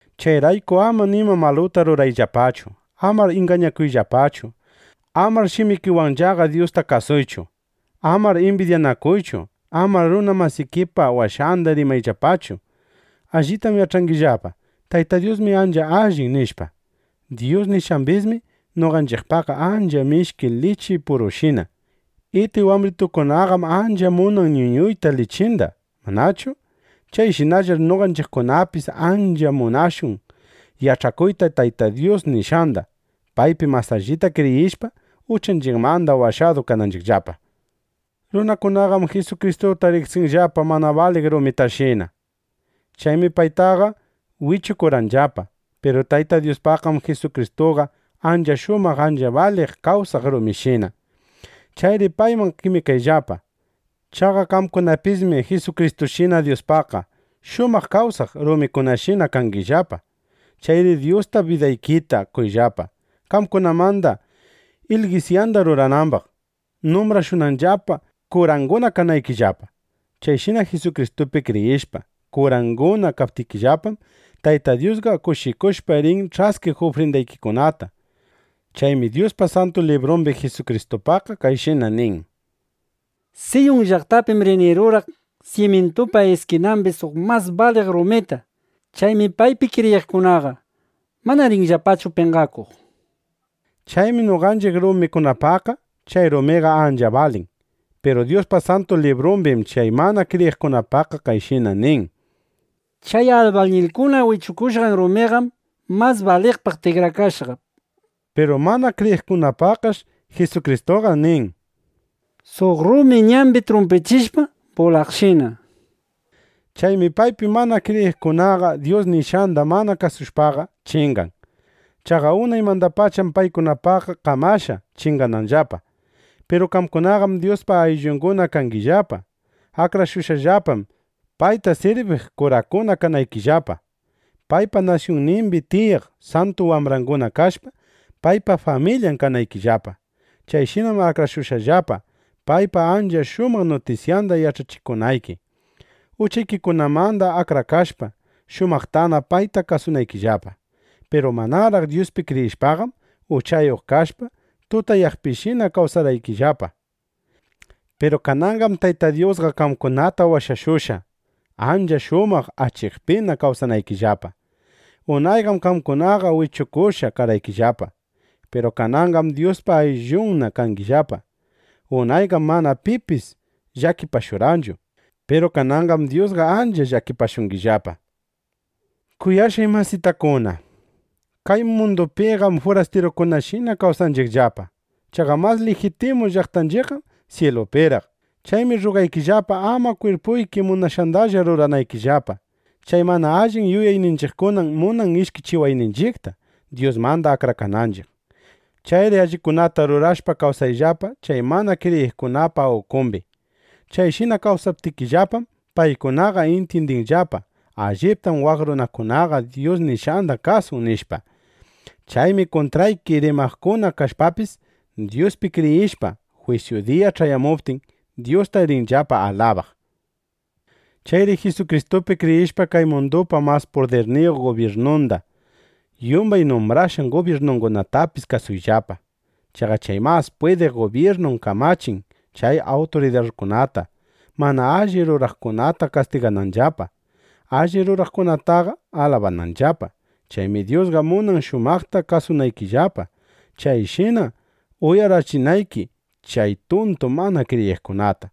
Chayrayku ama nima maluta rurayllapachu. Amar ingañakuyllapachu. Amar shimikiwanllaqa Dyusta kasuychu. Amar imbidyanakuychu. Amar runa masikipa washanda rimayllapachu. Allitam yach'angillapa: Tayta Dyusmi ancha allin, nishpa. Dyus nishqambismi noqanchiqpaqqa ancha mishki lichi purushina. Iti wambritukunaqam ancha munan ñuñuyta lichinda, ¿manachu? Chayshinallar noqanchiqkunapis ancha munashun yach'akuyta Tayta Dyus nishqanda, paypi mas allita kriyishpa, uchanchiqmanda washadu kananchiqllapa. Runakunaqam Jisukristuta riqsirqanllapa mana baliq rumitashina. Chaymi paytaqa wichukurqanllapa. Piru Tayta Dyuspaqqam Jisukristuqa ancha shumaq ancha baliq kawsaq rumishina. Chayri payman qemikayllapa. Chaqa qamkunapismi Jisukristushina Dyuspaqqa shumaq kawsaq rumikunashina kangillapa. Chayri Dyusta bidaykita qoyllapa, qamkunamanda ilgisyanda ruranambaq, numbrashunanllapa, kuranguna kanaykillapa. Chayshina Jisukristupi kriyishpa, kuranguna kaptikillapam, Tayta Dyusqa kushikushpa rin ch'askiq ufrindaykikunata. Chaymi Dyusqa Santu Librumbi Jisukristupaqqa kayshina nin: Siyun llaqtapim rini ruraq simyintupa iskinambi suq mas baliq rumita. Chaymi paypi kriyiqkunaqa mana rinllapachu penqakuq, nishpa. Chaymi noqanchiq kriyiqkunapaqqa chay rumiqa ancha balin. Piru Dyuspa Santu Librumbim chay mana kriyiqkunapaqqa kayshina nin: Chay albañilkuna wichukushqan rumiqam mas baliqpaq tikrakashqa, nishpa. Piru mana kriyiqkunapaqqash Jisukristuqa: Suq rumi ñambi trumpichishpa bulaqshina. Chaymi paypi mana kriyiqkunaqa Dyus nishqanda mana kasushpaqa chingan. Chaqa unaymandapacham paykunapaqqa kamashqa chingananllapa. Piru qamkunaqam Dyuspa ayllunna kangillapa. Akrashushqallapam, payta sirbiq kurakuna kanaykillapa, paypa nasyunnimbi tiyaq santu wambranguna kashpa, paypa familyan kanaykillapa. Chayshinam akrashushqallapa, paypa ancha shumaq nutisyanda yach'achikunayki, uchaykikunamanda akrakashpa, shumaqtana payta kasunaykillapa. Piru manaraq Dyuspi kriyishpaqam, uchayuq kashpa, tutayaqpishina kawsarqaykillapa. Piru kananqam Tayta Dyusqa qamkunata washashushqa, ancha shumaq achikpina kawsanaykillapa. Unayqam qamkunaqa wichukushqa karqaykillapa. Piru kananqam Dyuspa ayllunna kangillapa. Unayqam mana pipis llakipashurqanchu. Piru kananqam Dyusqa ancha llakipashungillapa. Kuyashqay masitakuna, kay mundupiqam furastirukunashina kawsanchiqllapa. Chaqa mas lijitimu llaqtanchiqqam syilupiraq. Chaymi rrugaykillapa, ama kwirpuyki munashqandalla ruranaykillapa. Chay mana allin yuyayninchiqkunam munan ishkichiwayninchiqta, Dyusmanda akrakananchiq. Chayri allikunata rurashpa kawsayllapa chay mana kriyiqkunapa ukumbi. Chayshina kawsaptikillapam, paykunaqa intyindinqallapa: Alliptam waq runakunaqa Dyus nishqanda kasun, nishpa. Chaymi kuntrayki rimaqkuna kashpapis, Dyuspi kriyishpa, jwisyu diya ch'ayamuptin, Dyusta rinllapa alabaq. Chayri Jisukristupi kriyishpa, kay mundupa mas pudirniyuq gubyirnunda, yumbay numbrashqan gubyirnungunatapis kasuyllapa. Chaqa chay mas pwidiq gubyirnum kamachin chay awturidarkunata, mana alli ruraqkunata kastigananllapa, alli ruraqkunataqa alabananllapa. Chaymi Dyusqa munan shumaqta kawsanaykillapa, chayshina uyarachinayki chay tuntu mana kriyiqkunata.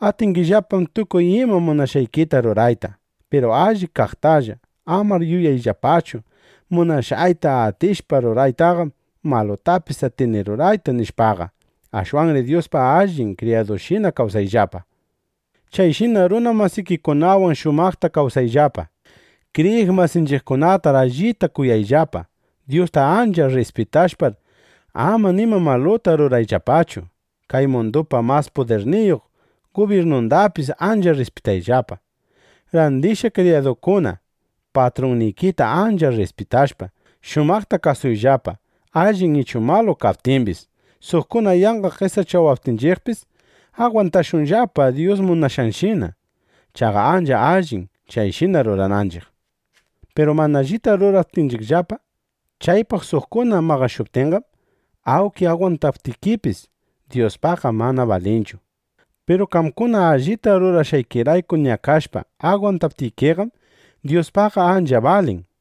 Atingillapam tukuy ima munashqaykita rurayta, piru alli kaqtalla. Amar yuyayllapachu: Munashqayta atishpa ruraytaqam, malutapis atini rurayta, nishpaqa. Ashwanri Dyuspa allin kriyadunshina kawsayllapa. Chayshinar runa masikikunawan shumaqta kawsayllapa. Kriyiq masinchiqkunatar allita kuyayllapa. Dyusta ancha rrispitashpar, ama nima maluta rurayllapachu. Kay mundupa mas pudirniyuq gubyirnundapis ancha rrispitayllapa. Randishqa kriyadukuna, patrunnikita ancha rrispitashpa, shumaqta kasuyllapa, allin ichu malu kaptimbis. Suqkuna yanqa qesachawaptinchiqpis, agwantashunllapa Dyus munashqanshina. Chaqa ancha allim, chayshina rurananchiq. Piru mana allita ruraptikillapa, chaypaq suqkuna maqashuptinqam, awnki agwantaptikipis, Dyuspaqqa mana balinchu. Piru qamkuna allita rurashqaykirayku ñakashpa, agwantaptikiqam, Dyuspaqqa ancha balin.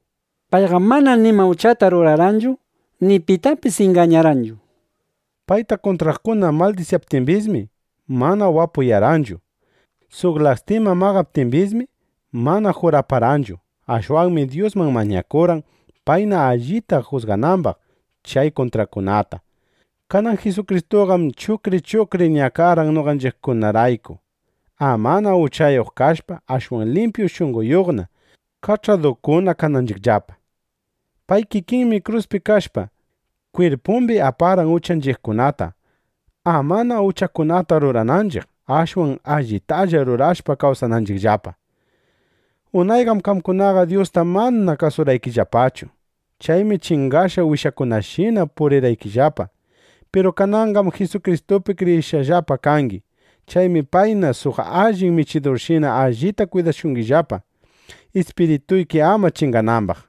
Payqam mana nima uchata rurarqanchu, ni pitapis ingañarqanchu. Payta kuntraqkuna maldisyaptimbismi, mana wapuyarqanchu. Suq lastima maqaptimbismi, mana juraparqanchu. Ashwanmi Dyusman mañakurqan, payna allita jusganambaq chay kuntraqkunata. Kanan Jisukristuqam chuqri chuqri ñakarqan noqanchiqkunarayku, amana uchayuq kashpa, ashwan limpyu shunqona, kach'akaduna kananchiqllapa. Pay kikinmi kruspi kashpa, kwirpumbi aparqan uchanchiqkunata, amana uchakunata rurananchiq, ashwan allitalla rurashpa, kawsananchiqllapa. Unayqam qamkunaqa Dyusta mana kasurqaykillapachu. Chaymi chingashqa wishakunashina purirqaykillapa. Piru kananqam Jisukristupi kriyishqallapa kangi. Chaymi payna suq allin michidurshina allita kwidashungillapa, ispirituyki ama chinganambaq.